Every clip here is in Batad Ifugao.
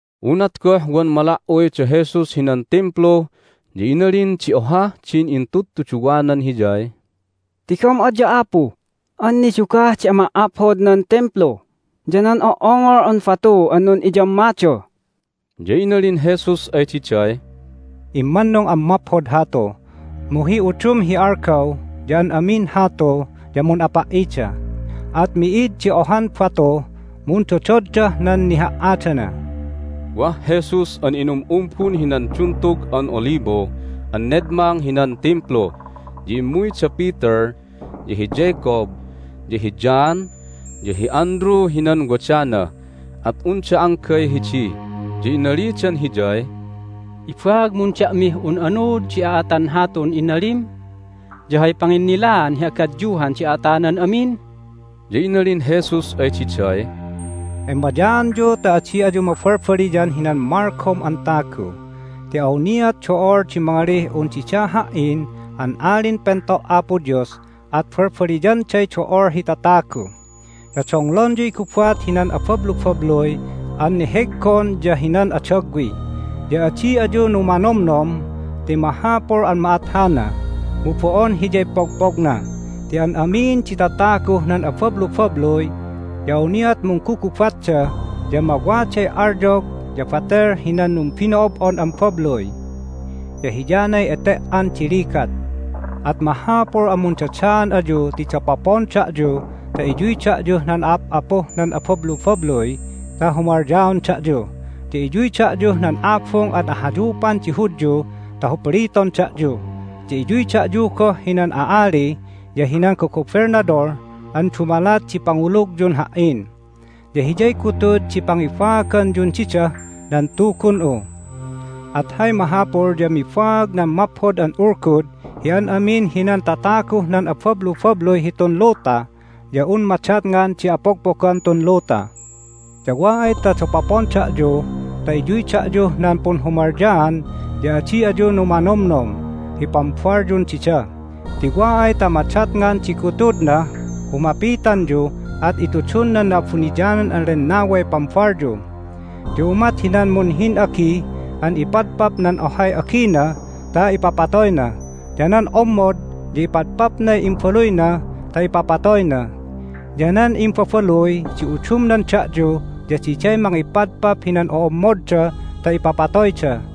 Unat goh wan mala"uy da Jesus hinan Timplu ya inalin di ohah din intudtuduwanan Hiyay, "Tigom adya, Apu, an nidugah di ama"aphod nan Timplu ya nan o"ongol an batu an nun'iyammada!" Ya inalin Jesus ay diday, "Immannung an maphod hatu, mu hi udum hi algaw ya an amin hatu ya mun'apa"ida, at mi'id di ohan batuh mundododdah nan niha"adana." Hay Aat di Punligatan di Tatagu Wah Jesus an inum'umbun hinan Duntug an Olibo an nedmang hinan Timplu, ya immuy da Peter, ya hi Jacob, ya hi John, ya hi Andrew hinan wadana, at unda anggay hidi, ya inalidan Hiyay, "Ibaagmun da'mih un anuud di a'atan hatun inalim? Ya hay panginnilaan hi agadyuhan di a'atanan amin?" Ya inalin Jesus ay diday, "Emayaanyu ta adi ayu mabalbaliyan hinan malgom an tagu. Ti awniat do'ol di mangalih un didah Ha"in an Alin Pento' Apo Dios, at balbaliyanday do'ol hi tatagu. Ya donglonyuy gubat hinan abablubabluy an neheggon ya hinan adagwi, ya adi ayu numanomnom. Ti mahapul an ma'at hana, mu bo'on hiyay pogpogna ti an amin di tataguh nan abablubabluy ya awniat munggugubatda, ya mawaday alyog ya batel hinan numbino'ob'on an babluy. Ya hiyanay ete"an di ligat. At mahapul an mundadaan ayu ti dapopon da'yu ta iyuy da'yuh nan a'ap'apuh nan abablubabluy ta humalyaon da'yu. Ya iyuy da'yuh nan abung an ahayupan di Hudyu ta hupliton da'yu, ya iyuy da'yu goh hinan a'ali ya hinan gogobelnadol an dumalat di pangulugyun Ha"in. Ya hiyay gutud di pangibaaganyun didah nan Tugun'u. At hay mahapul ya mibaag nan Maphod an Ulgud hi an amin hinan tataguh nan abablubabluy hitun luta ya un madatngan di apogpogan tun luta. Ya wa ay ta dapopon da'yu ta iyuy da'yuh nan punhumalyaan ya adi ayu numanomnom hi pambalyun dida, ti wa ay ta madatngan di gutudnah humapitanyu at itudun nan Na'abuniyanan an Lennaway pambalyu. Ya umat hinan munhin'agi an ipadpap nan ohay agina ta ipapatoyna. Ya nan ommod ya ipadpapnay imbaluyna ta ipapatoyna, ya nan imbabaluy di udumnan da'yu ya diday mangipadpap hinan o'ommodda ta ipapatoyda.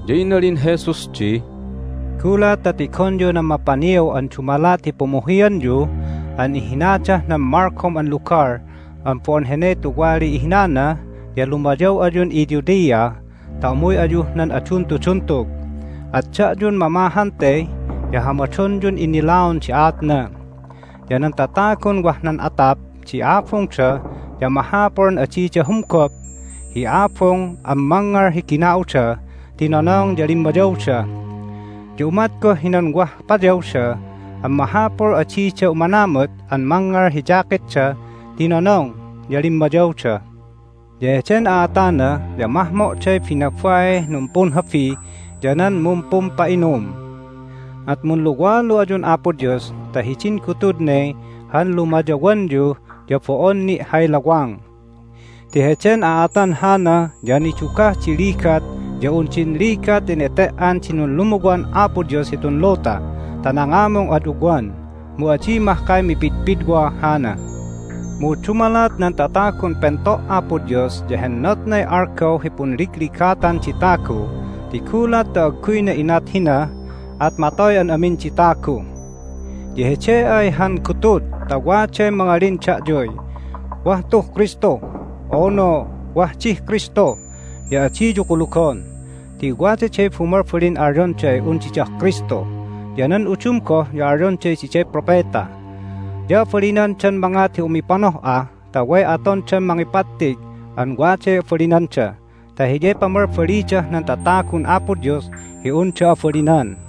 Ya inalin Jesus di, "Gulat ta tigonyu nan mapaniaw an dumalat hi pumuhianyu an ihinadah nan malgom an lugal an bo'on hene tuwaliy ihinana ya lumayaw ayun iJudea ta umuy ayuh nan aduntuduntug. At da'yun mamahan te ya hamadonyun innilaon di aatna! Ya nan tatagun wah nan atap di abungda ya mahapul an adida humgop hi abung an mangngal hi gina'uda ti nonong ya limmayawda. Ya umat goh hinan wah payawda an mahapul di adida umanamut an mangngal hi jacketda ti nonong ya limmayawda. Ya heden a'atana ya mahmo'day binabaih numpunhabi ya nan mumpumpa'inum! At munluwalu ayun Apo Dios ta hidin gutud ne han lumayawanyu ya bo'on ni' hay lawang! Ti heden a'atan hana ya nidugah di ligat ya un din ligat hi nete"an di nunlumuwan Apo Dios hitun luta ta nangamung ad ugwan. Mu adi mahkay mipidpidwa hana. Mu dumalat nan tatagun pento' Apo Dios ya hennotnay algaw hi punligligatan di tagu ti gulat ta agguyna inat hina at matoy an amin di tagu. Ya hede ay han gutud ta waday mangalin da'yuy, Wah tuh Kristu! unu, Wah dih Kristu! ya adiyu kulugon ti wadaday bumalbalin alyonday un didah Kristu, ya nan udum goh ya alyonday diday propeta. Ya abalinandan mangat hi umipanoh'a ta way atondan mangipattig an waday abalinanda ta hiyay pamalbalidah nan tatagun Apo Dios hi unda abalinan.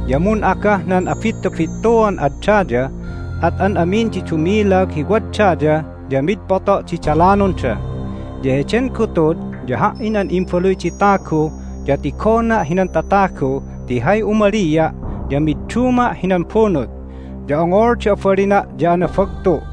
Ya mun'agah nan abittubittuan ad daya, at an amin di dumilag hi wad daya ya mid poto' di dalanonda. Ya heden gutud ya Ha"in an Imbaluy di Tagu ya tigona' hinan tatagu ti hay umalia' ya midduma' hinan bunut, ya ongol di abalina' ya anabagtu'.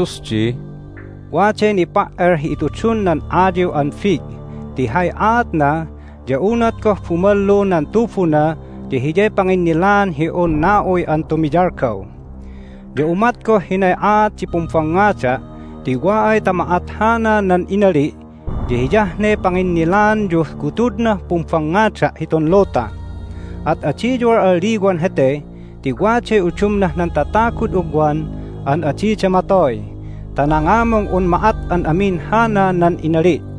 Ya inalin Jesus di, "Waday nipa"el hi itudun nan ayiw an fig ti hay aatna ya unat goh bumalu nan tubuna ya hiyay panginnilaan hi un na'uy an tumiyalgaw. Ya umat goh hinay aat di pumbangngada' ti wa ay ta ma'at hana nan inali' ya hiyah ne panginnilaanyuh gutudnah pumbangngada' hitun luta. At adiyu al'alliwan hete ti waday udumnah nan tatagud ugwan an adida matoy ta nangamung un ma'at an amin hana nan inali'.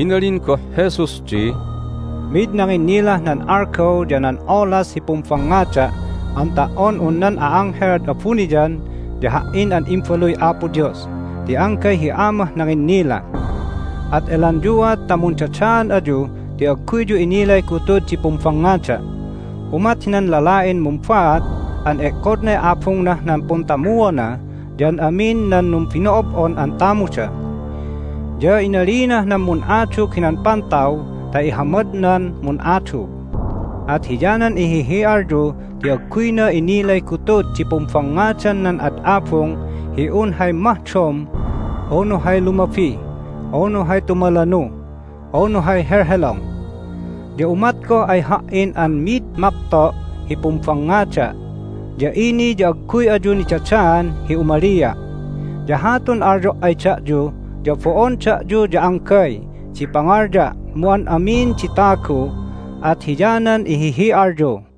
Inalin goh Jesus di, "Mid nanginnilah nan algaw ya nan olas hi pumbangngada' an ta"on un nan a'anghel ad abuniyan ya Ha"in an Imbaluy Apo Dios, ti anggay hi Amah nanginnila. At elanyuat ta mundadaan ayu ti agguyyu inilay gutud di pumbangngada'. Umat hinan lala'in mumbaat an e'kodnay abungnah nan puntamuona ya an amin nan numbino'ob'on an tamuda. Ya inalinah nan mun'adug hinan pantaw ta ihamadnan mun'adug. At hiyanan ihihi'alyu ti agguyna innilay gutud di pumbangngadan nan ad abung hi un hay mahdom, unu hay lumabi, unu hay tumalanu, unu hay helhelong. Ya umat goh ay Ha"in an mi'id mapto' hi pumbangngada', ya ini ya agguy ayu nidadaan hi umalia'! Ya hatun alyo' ay da'yu ya bo'on da'yu ya anggay di pangalya' mu an amin di tagu, at hiyanan ihihi'alyu."